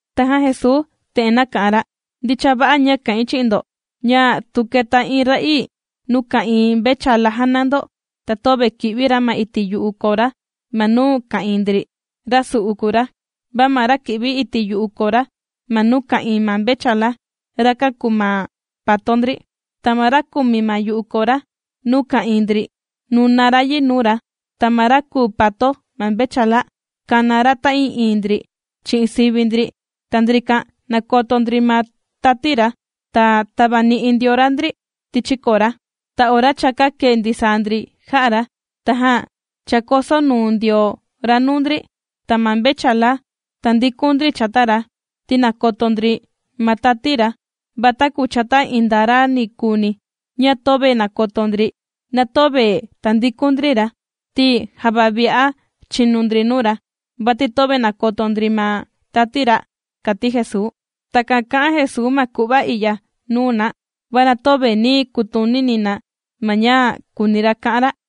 Tajan Jesuu te'en nāka'an ra: ―Ndicha va'a ña kà'in chi'in ndo, ña tu kèta iin ra'ii nuu ka'ìin mvechala jàna ndo, ta töve kì'vi ra ma iti' yu'u kora ma nuu ka'ìin ndri, rasu'u kùu ra. Va ma ra kì'vi iti' yu'u kora ma nuu ka'ìin ma mvechala, rakan kùu ma pato ndri. Ta ma ra kùmi ma yu'u kora nuu ka'ìin ndri, nùna ra yi nuu ra, ta ma ra kùu pato ma mvechala, kàna ra ta'ii'iin ndri chi'in sivi ndri. Ta ndrikan nàkoto ndri ma tati ra, ta tàvani'i ndio ra ndri tichi kora. Ta ora cha kākee ndisaa ndri jà'a ra, tajan chākoso nuu ndio ra nuu ndri, ta ma mvechala tāndikun ndri chata ra, ti nàkoto ndri ma tati ra. Va taku chata iin nda ra ni kuuni ña töve nàkoto ndri, na töve tàndikun ndri ra, ti java vi'a chìnu ndri nuu ra, vati töve nàkoto ndri ma tati ra ―kàti Jesuu. Takan kà'an Jesuu ma ku'va i'ya nuu na, va na töve nī kutunini na ma ña kùuni ra ka'an ra.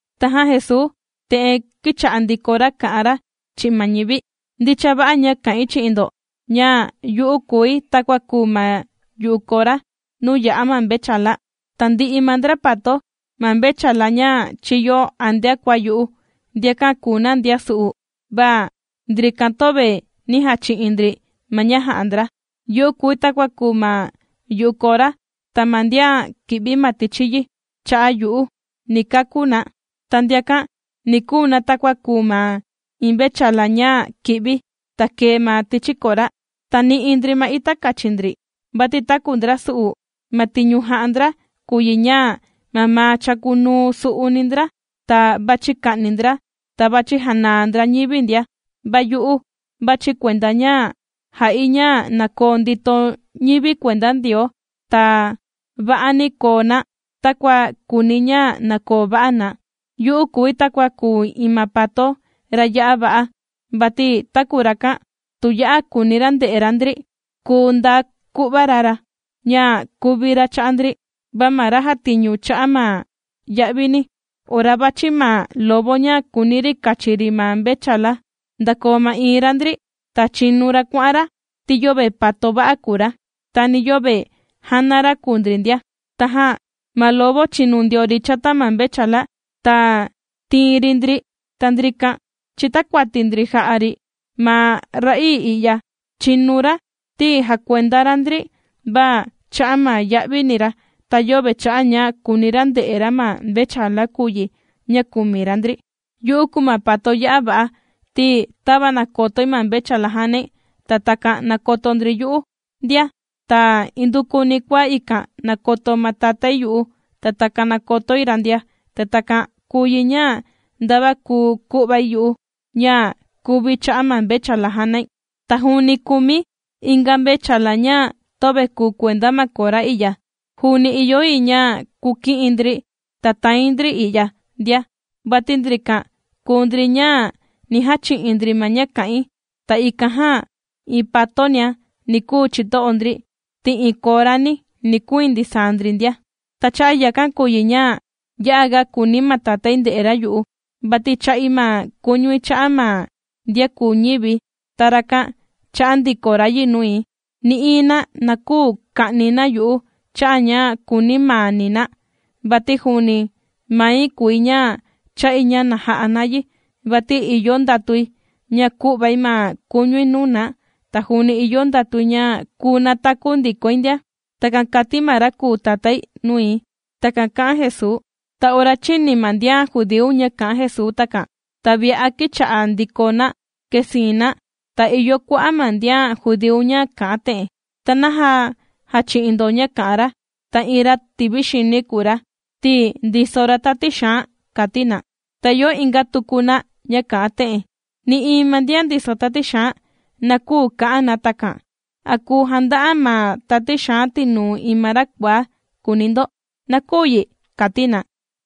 Tajan Jesuu te'en kīcha'a ndiko ra kà'an ra chi'in ma ñivi: ―Ndicha va'a ña kà'in chi'in ndo ña yu'u kùi takua kùu ma yu'u kora nuu yà'a ma mvechala. Tandi'i ma ndra pato ma mvechala ña chīyo antea kua yu'u, ndrakan kùu ndra ndra su'u, va ndrikan töve nī jachi'in ndri ma ña jā'a ndra. Yu'u kùi takua kùu ma yu'u kora, ta ma ndian kì'vi ma tichi yi cha'a' yu'u, ni kakú na. Ta ndiakan ni kuu na takua kùu ma iin mvechala ña kì'vi, ta kèe ma tichi kora, ta nì'i ndri ma ita kachi ndri. Vati taku ndra su'u, ma tiñu jà'a ndra kùu yi ña mamaa chàkunuu su'uni ndra, ta vàchi ka'ni ndra, ta vàchi janaa ndra ñivi ndia, va yu'u vàchi̱ kuenda ña jà'i ña na koo ndito ñivi kuenda Ndioo, ta va'ani koo na takua kùuni̱ ña na koo va'a na. Yu'u kùi takua kùu iin ma pato ra ya'a va'a, vati taku rakan, tu ya'a kùuni ra nde'e ra ndri, kùu nda ku'va ra ra ña kuvi ra cha'a' ndri. Va ma ra jàtiñu cha'a' ma ya'vini, ora vàchi ma lobo ña kùuni ri kachi ri ma mvechala, ndàkoo ma'iin ra ndri, ta chìnu ra kuà'an ra, ti yöve pato va'a kùu ra, ta ni yöve jàna ra kùu ndri ndia. Tajan ma lobo, chìnu ndio ri chata ma mvechala, ta tìin ri ndri, ta ndrikan chìtakuati ndri jà'a ri. Ma ra'ii i'ya chìnu ra, ti jàkuenda ra ndri, va cha'a' ma ya'vini ra, ta yöve cha'a' ña kùuni ra nde'e ra ma mvechala kùu yi ña kùmi ra ndri. ’Yu'u kùu ma pato ya'a va'a, ti tava nàkotoi ma mvechala jànai, ta takan nàkoto ndri yu'u ndia. Ta indukuni kua ikan nàkoto ma Tatái yu'u, ta takan nàkotoi ra ndia. Ta takan kùu yi ña, ndava kùu ku'vai yu'u ña kùvi̱ cha'a' ma mvechala jànai. Ta juuni kùmi̱ inga mvechala ña töve kùu kuenda ma kora i'ya, juuni ìyo yi ña kuki'i̱n ndri ta tàin ndri i'ya ndia. Vati ndrikan kùu ndri ña ni jachi'in ndri ma ña kà'in. Ta ikan jan iin patonia ni kuu chito'o ndri, ti iin korani ni kuiin ndisaa ndri ndia. ’Ta cha'a' yakan kùu yi ña, ya'a ga kùuni ma Tatái nde'e ra yu'u, vati chà'i ma kuñui cha'a' ma ndian kùu ñivi̱, ta rakan chà'a ndiko ra yi nui. Nï'iin na, na küu ka'ni na yu'u cha'a' ña kùuni maani na, vati juuni mai kùi ña chà'i ña na ja'a na yi. Vati ìyo ndatui ña ku'vai ma kuñui nuu na, ta juuni ìyo ndatui ña kùu nataku ndikoi ndia. Takan kāti ma ra kùu Tatái nui. ―Takan kà'an Jesuu. Ta ora chīni ma ndian judíu ña kā'an Jesuu takan, ta vi'a kīcha'a ndiko na kèsiin na. Ta ìyo kua'a' ma ndian judíu ña kà'an te'en: ―¿Ta naja jàchi'in ndo ña kà'an ra, ta iin ra tivi xini kùu ra, ti ndiso ra tati xaan? ―kàti na. Ta ìyo inga tuku na ña kà'an te'en: ―Nï'iin ma ndian ndiso tati xaan, na küu ka'an na takan. ¿A kùu janda'a ma tati xaan tinuu iin ma ra kuaá?, kùuni ndo. Na küu yi ―kàti na.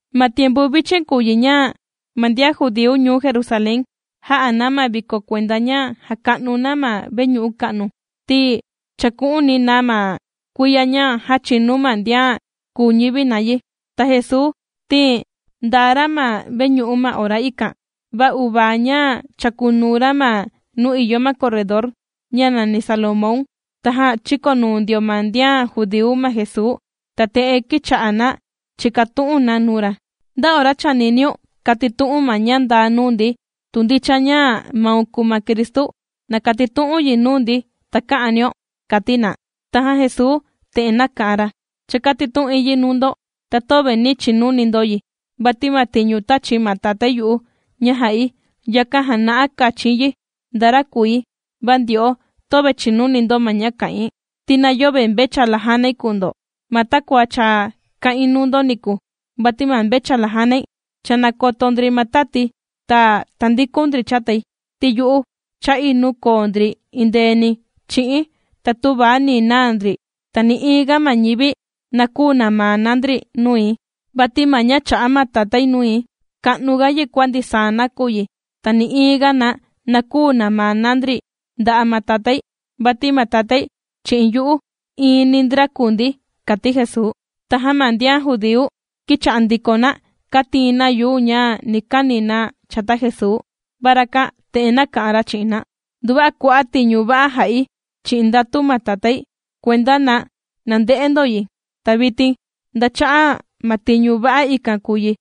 Ma tiempu vichin kùu yi ña, ma ndian judíu ndian ñuu Jerusalén, jà'a na ma viko kuenda ña jàka'nu na ma veñu'u ka'nu, ti chàku'uni na ma kuiya ña jāchinu ma ndian kūu ñivi na yi. Ta Jesuu ti ndaa ra ma veñu'u ma ora ikan, va uvaa ña chàkunuu ra ma nuu ìyo ma corredor ña nàni Salomón. Tajan chīkonuu ndio ma ndian judíu ma Jesuu, ta te'en kīcha'a na chìkatu'un na nuu ra: ―¿Nda ora chàniniun kàtitu'u̱n ma ña ndaa nuu ndi? Tu ndicha ña maun kùu ma Cristu, na katitu'un yi nuu ndi taka'anio ―kàti na. Tajan Jesuu te'en nāka'an ra: ―Cha kātitu'in yi nuu ndo, ta töve nī chinuni ndo yi. Vati ma tiñu tāchi ma Tatái yu'u ña ja'i, yakan jàna'a kachin yi nda ra kùi. Va ndyo'o, töve chìnuni ndo ma ña kà'in, ti na yöve mvechala jànai kùu ndo, ma takua cha kā'in nuu ndo niku. Vati ma mvechala jànai, cha nàkoto ndri ma tati̱, ta tàndikun ndri chatai. Ti yu'u chà'i nuu koo ndri endeeni chi'i̱n, ta töva ni naa ndri. Ta nï'iin ga ma ñivi na küu namaa na ndri nui. Vati ma ña chā'a ma Tatái nui, ka'nuga yi kua ndisaa nakuyi. Ta nï'iin ga na, na küu namaa na ndri nda'a' ma Tatái. Vati ma Tatái, chi'in yu'u, iini ndra kùu ndi ―kàti Jesuu. Tajan ma ndian judíu, kīcha'a ndiko na kàtiin na yuu ña ni kani na chata Jesuu. Va rakan te'en nāka'an ra chi'in na: ―Nduva'a kua'a' tiñu va'a jā'i chi'in ndatu ma Tatái, kuenda na nande'e ndo yi. Ta vitin, ¿nda cha'a' ma tiñu va'a ikan kùu yi,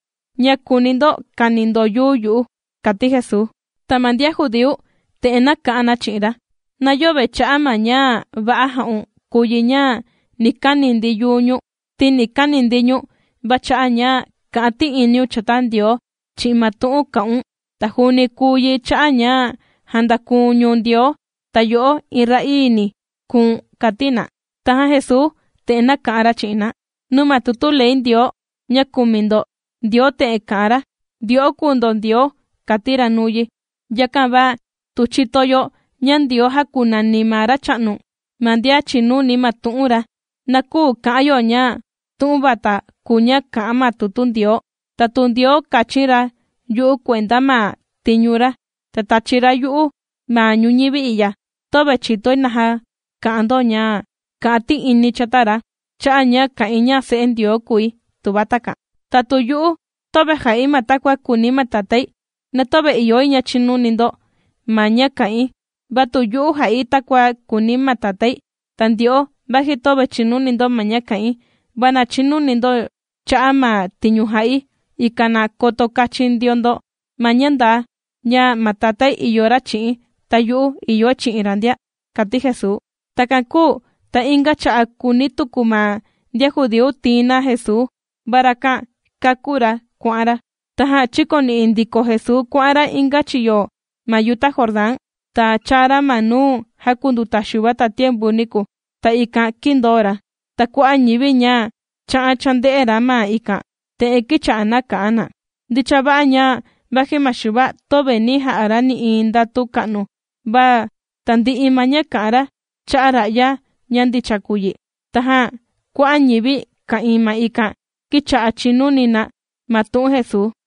ña kùuni ndo kani ndo yuu yu'u? ―kàti Jesuu. Ta ma ndian judíu te'en nāka'an na chi'in ra: ―Na yöve cha'a' ma ña va'a jā'un kùu yi ña ni kani ndi yuu ñu̱n, ti ni kani ndi ñu̱n, va cha'a' ña kà'an ti'iniun chata Ndioo chi'in ma tu'un kà'un. Ta juuni kùu yi cha'a' ña jàndaku̱n ñu̱n Ndioo, ta yo'o iin ra'ii ni kùu̱n ―kàti na. Tajan Jesuu te'en nāka'an ra chi'in na: ―Nuu ma tutu ley Ndioo ña kùmi ndo, Ndioo te'en kà'an ra: “Ndyo'o kùu ndo ndioo”, kāti ra nuu yi. Yakan va tu chìto yo ña ndioo jākunani ma Racha'nu, ma ndian chìnuni ma tu'un ra, na küu ka'an yo ña tu'un vata kùu ña kà'an ma tutu Ndioo. Ta tu Ndioo kāchin ra yu'u kuenda ma tiñu ra, ta tāchi ra yu'u ma ñuñivi i'ya, töve chìtoi naja kà'an ndo ña kà'an ti'ini̱ chata ra, cha'a' ña kà'in ña Se'e Ndioo kùi, tuva takan. Ta tu yu'u töve jà'i ma takua kùuni ma Tatái, na töve ìyo yi ña chinuni ndo ma ña kà'in. Va tu yu'u jà'i takua kùuni ma Tatái, ta ndyo'o vaji töve chìnuni ndo ma ña kà'in, va na chinuni ndo cha'a' ma tiñu jà'i, ikan na koto kachin ndio ndo ma ña ndaa, ña ma Tatái ìyo ra chi'i̱n, ta yu'u ìyoi chi'in ra ndia ―kàti Jesuu. Takan kūu ta inga cha'a' kūuni tuku ma ndian judíu tiin na Jesuu, va rakan kākú ra kuà'an ra. Tajan chīkoni'i ndiko Jesuu kuà'an ra inga chiyo ma yuta Jordán, ta chāa ra ma nuu jākunduta Xuva tatiempu niku, ta ikan kīndoo ra. Ta kua'a' ñivi, ña chā'an chānde'e ra ma ikan, te'en kīcha'a na kà'an na: ―Ndicha va'a ña vaji ma Xuva, töve nī ja'a ra nï'iin ndatu ka'nu, va tandi'i ma ña kā'an ra cha'a' ra'ya, ña ndicha kùu yi. Tajan kua'a' ñivi ka'ìin ma ikan, kīcha'a chìnuni na ma tu'un Jesuu.